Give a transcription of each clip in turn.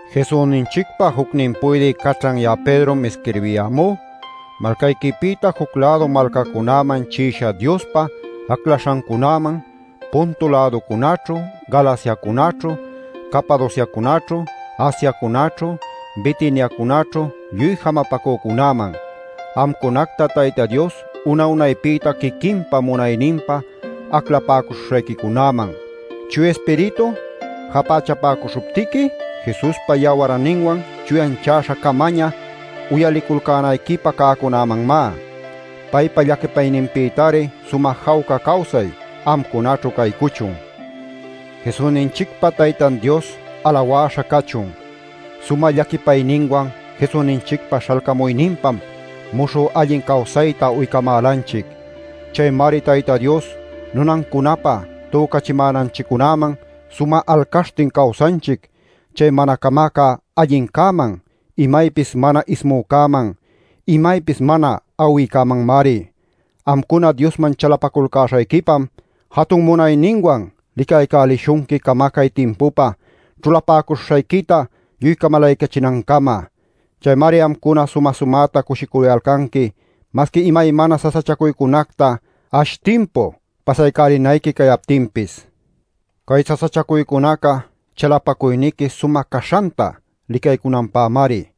Jesusninchicpa jucnin puydï caćhan ya'a Pedrom isquirbiyämú, malcayquipïta juc-lädu malcacunäman chi'isha Diospa aclaśhancunäman, Ponto-läducunaćhu, Galaciacunaćhu, Capadociacunaćhu, Asiacunaćhu, Bitiniacunaćhu lluy jamapacücunäman, amcunacta Tayta Dios una-unaypïta quiquinpa munayninpä aclapäcuśhuśhayquicunäman, Chuya Ispiritu japächapäcuśhuptiqui Jesuspa yawarninwan chuyanchäśha-camaña uyaliculcänayquipä cäcunämanmá. Paypa llaquipayninpïtari sumä jawca cawsay amcunaćhu caycuchun. ¡Jesusninchicpa Taytan Dios alawäśha cachun! Sumä llaquipayninwan Jesusninchicpa śhalcamuyninpam muśhü allin cawsayta uycamälanchic. Chaymari Tayta Dios nunancunapä tücachimänanchiccunäman sumä alcaśhtin cawsanchic, chay mana camacä allincäman, imaypis mana ismücäman, imaypis mana awïcämanmari. Amcuna Diosman chalapaculcäśhayquipam jatun munayninwan licaycälishunqui camacay timpupä ćhulapuśhuśhayquita lluy camalaycachinancama. Chaymari amcuna sumä-sumäta cushicuyalcanqui masqui imaymana sasachacuycunacta ash timpu pasaycälinayqui cayaptinpis. Cay sasachacuycunaca chalapacuyniqui sumä caśhanta licaycunanpämari.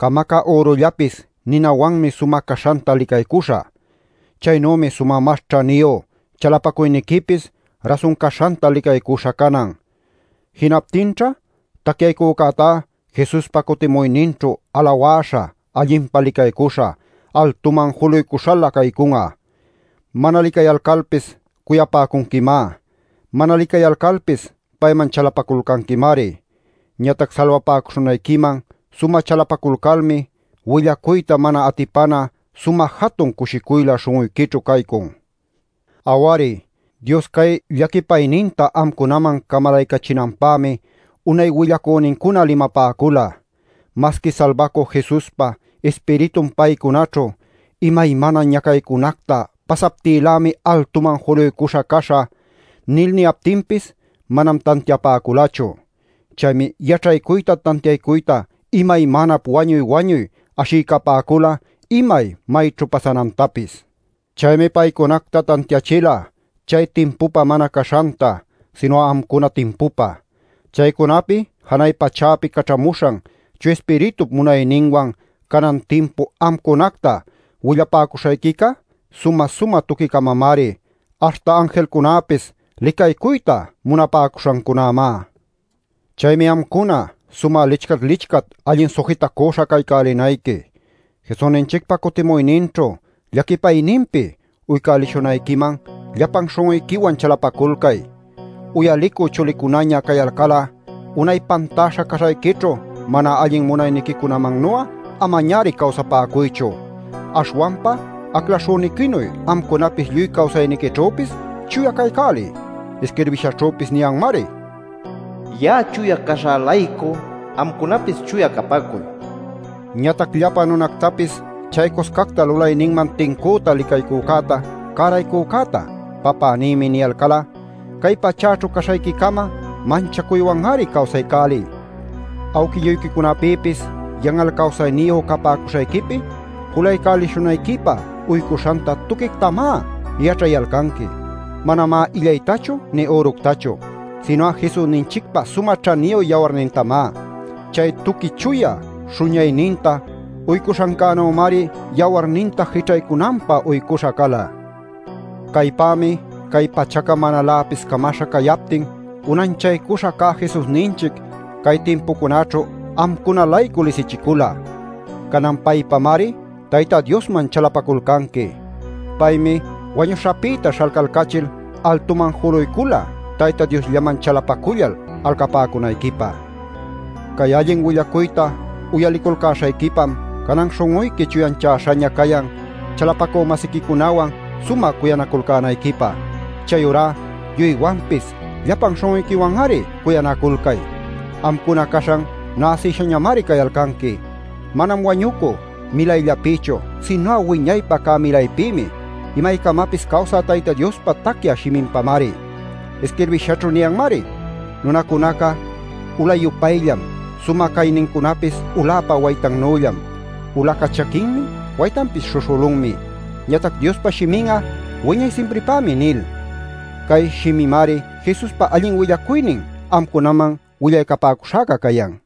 Camacä ürullapis ninawanmi sumä caśhanta licaycuśha. Chaynümi sumä mas ćhaniyu chalapacuyniquipis rasun caśhanta licaycuśha canan. Jinaptinćha tacyaycücätá Jesuspa cutimuyninćhu alawäśha, allinpa licaycuśha, altuman juluycuśhalä caycun'a. Mana licayalcalpis cuyapäcunquimá; mana licayalcalpis payman chalapaculcanquimari. Ñatac salbapäcuśhunayquiman sumä chalapaculcalmi willacuyta mana atipana sumä jatun cushicuylä śhun'uyquićhu caycun. Aw-ari, Dios cay llaquipayninta amcunaman camalaycachinanpämi unay willacünincuna limapäcula. Masqui Salbacü Jesuspa Ispiritun paycunaćhu “Imaymana ñacaycunacta pasaptïlämi altuman juluycuśha caśhä” nil niyaptinpis manam tantiapäculachu. Chaymi yaćhaycuyta tantiaycuyta imaymanap wañuy-wañuy ashiycapäcula imay mayćhu pasanantapis. Chaymi paycunacta tantiachila chay timpupä mana caśhanta, sinu'a amcuna timpupä. Chaycunapi janay pachäpi caćhamuśhan Chuya Ispiritup munayninwan canan timpu amcunacta willapäcuśhuśhayquica sumä-sumä tuqui-camamari, aśhta anjilcunäpis licaycuyta munapäcuśhancunämá. Chaymi amcuna sumä lichcat-lichcat allin sujitacüśha caycälinayqui. Jesusninchicpa cutimuyninćhu llaquipayninpi uycälishunayquiman llapan śhun'uyquiwan chalapaculcay. Uyalicü chulicunaña cayalcal'a unay pantäśha caśhayquićhu mana allin munayniquicunamannu'a amañari cawsapäcuychu. Aśhwanpa aclaśhüniquinuy, amcunapis lluy cawsayniquićhüpis chuya caycäliy. Isquirbishaćhüpis niyanmari: “Ya'a chuya caśhä-laycu amcunapis chuya capäcuy” nil. Ñatac llapa nunactapis chaycuscacta lulayninman tincüta licaycücäta, cäraycücäta “papänïmi” niyalcal'a, cay pachäćhu caśhayqui-cama manchacuywan-ari cawsaycäliy. Awquilluyquicunapïpis yan'al cawsayniyu capäcuśhayquipi julaycälishunayquipä uycuśhanta tuquictamá yaćhayalcanqui; manamá illaytachu nï üructachu, sinu'a Jesusninchicpa sumä ćhaniyu yawarnintamá. Chay tuqui chuya śhuñayninta uycuśhancänümari yawarninta jićhaycunanpä uycuśha cala. Caypämi cay pachaca manaläpis camaśha cayaptin unanchaycuśha cä Jesusninchic cay timpucunäćhu amcuna-laycu lisichicula. Canan paypamari Tayta Diosman chalapaculcanqui. Paymi wañuśhapïta śhalcalcachil altuman juluycula Tayta Diosllaman chalapacullal alcapäcunayquipä. Cay allin willacuyta uyaliculcäśhayquipam canan śhun'uyqui chuyanchäśhaña cayan chalapacü-masiquicunawan sumä cuyanaculcänayquipä. Chayurá lluywanpis llapan śhun'uyquiwan-ari cuyanaculcay. Amcuna caśhan näsïshañamari cayalcanqui; manam wañucü milayllapïchu, sinu'a wiñaypä cä milaypïmi, imaycamapis cawsä Tayta Diospa tacyä shiminpamari. Isquirbïshaćhu niyanmari: “Nunacunaca ula-yupayllam. Sumä caynincunapis uläpa waytannüllam. Ulaca chaquinmi, waytanpis śhuśhülunmi. Ñatac Diospa shimin'a wiñay simpripämi” nil. Cay shimimari Jesuspa allin willacuynin amcunaman willaycapäcuśhäca cayan.